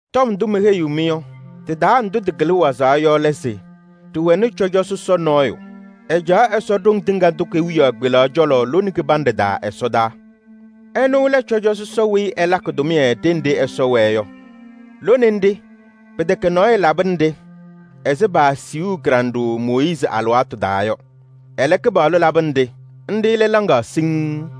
Tɔm ndʋ meheyiɣ-mɩ yɔ, tɩ-taa ndʋ tɩkɩlɩ wazaɣ yɔ lɛ se: ɖɩwɛnɩ cɔjɔ sɔsɔ nɔɔyʋ. Ɛcaɣ Ɛsɔ Ɖoŋ Tɩŋa Tʋ kewiyaɣ kpelaɣ cɔlɔ lone kɩbanɖɛ taa ɛsɔdaa. Ɛnʋ lɛ cɔjɔ sɔsɔ weyi ɛlakɩ tʋmɩyɛ ɖenɖe Ɛsɔ wɛɛ yɔ. Lone nɖɩ, pɩtɛkɛ nɔɔyʋ labɩnɩ-ɖɩ ɛzɩ paasiɣu kɩɖanɖʋʋ Mooyiizi alɩwaatʋ taa yɔ. Ɛlɛ, Kɩpaɣlʋ labɩnɩ-ɖɩ, nɖɩ lɛ laŋaɣ siŋŋ.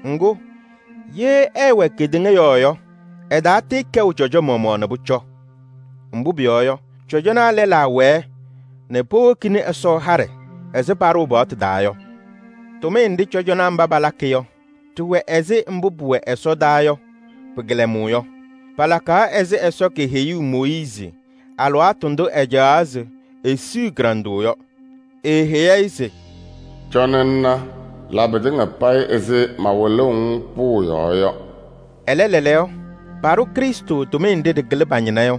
Ŋgʋ, ye ɛɛwɛ kedeŋa yɔɔ yɔ, ɛtaatɩɩkɛʋ cɔjɔ maɣmaɣ nɛ pʋcɔ. Mbʋ pʋyɔɔ yɔ, cɔjɔnaa lɛlaa wɛɛ nɛ powokini Ɛsɔ haɖɛ ɛzɩ paɖʋʋ paɣtʋ taa yɔ. Tʋmɩyɛ nɖɩ cɔjɔnaa mba palakɩ yɔ, ɖɩwɛ ɛzɩ mbʋ pʋwɛ ɛsɔdaa yɔ pɩ-kɩlɛmʋʋ yɔ. Palakaɣ ɛzɩ Ɛsɔ keheyuu Mooyiizi alɩwaatʋ ndʋ ɛcaɣaɣ se esiɣ-i kɩɖanɖʋʋ yɔ. Eeheyi-i se: “Cɔnɩ ŋna, la pɩtɩŋa payɩ ɛzɩ mawɩlʋʋ-ŋ pʋʋ yɔɔ yɔ.” Ɛlɛ lɛɛlɛɛyɔ, paɖʋ Krɩstʋ tʋmɩyɛ nɖɩ ɖɩkɩlɩ pa-ñɩna yɔ.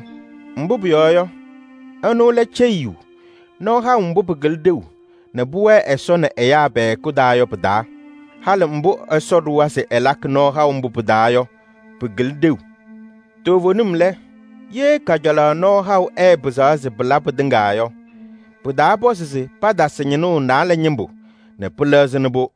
Mbʋ pʋyɔɔ yɔ, ɛnʋ lɛ ceyiyu nɔɔ haʋ mbʋ pɩkɩlɩ ɖeu nɛ pʋwɛɛ Ɛsɔ nɛ ɛyaa pɛ-hɛkʋ taa yɔ pɩ-taa. Halɩ mbʋ Ɛsɔ ɖʋwa se ɛlakɩ nɔɔ haʋ mbʋ pɩ-taa yɔ, pɩkɩlɩ ɖeu. Toovenim lɛ, ye kajalaɣ nɔɔ haʋ ɛɛpɩzaɣ se pɩla pɩtɩŋa yɔ, pɩtaapɔzɩ se patasɩ ñɩnʋʋ naalɛ ñɩmbʋ nɛ pɛlɛdɩ.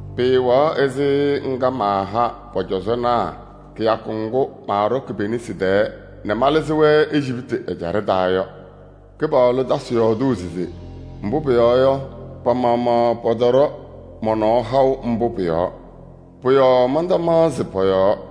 Pɩɩwɛɣ ɛzɩ ŋga maaha pɔ-cɔzɔnaa kɩyakʋ ŋgʋ malɩzɩ-wɛ nɛ Ejiptɩ ɛjaɖɛ taa yɔ. Mbʋ pʋyɔɔ yɔ, pa-maɣmaɣ pɔtɔɖɔ mɔ-nɔɔ haʋ mbʋ pʋ-yɔɔ. Pʋ-yɔɔ mantamaɣzɩ pɔ-yɔɔ.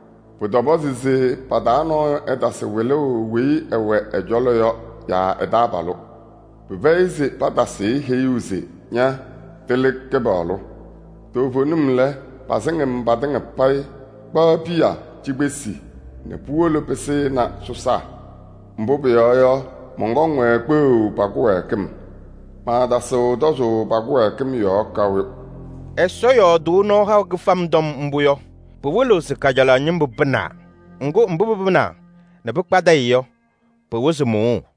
Pʋtɔpɔzɩ se pa-taa nɔɔyʋ ɛtasɩ wɩlʋʋ weyi ɛwɛ ɛ-cɔlɔ yɔ yaa ɛ-taabalʋ se: ‘Ña, tɩlɩ Kɩpaɣlʋ!’ Toovenim lɛ, pasɩŋ-m patɩŋa payɩ, kpaɣ piya cikpesi nɛ puwolo pɩsɩnɩ sɔsaa. Mbʋ pʋyɔɔ yɔ, mɔnkɔŋ-wɛ kpeɣu pa-kɩwɛɛkɩm. Maatasɩɣ tɔzʋʋ pa-kɩwɛɛkɩm yɔɔ kaʋ.” Ɛsɔ yɔɔdʋʋ nɔɔ haʋ kɩfam tɔm mbʋ yɔ, pɩwɩlɩɣ se kajalaɣ ñɩmbʋ pɩnaa. Ŋgʋ, mbʋ pɩpɩnaa nɛ pɩkpadɩyɩ yɔ, pɩwɩzɩ mʋʋʋ.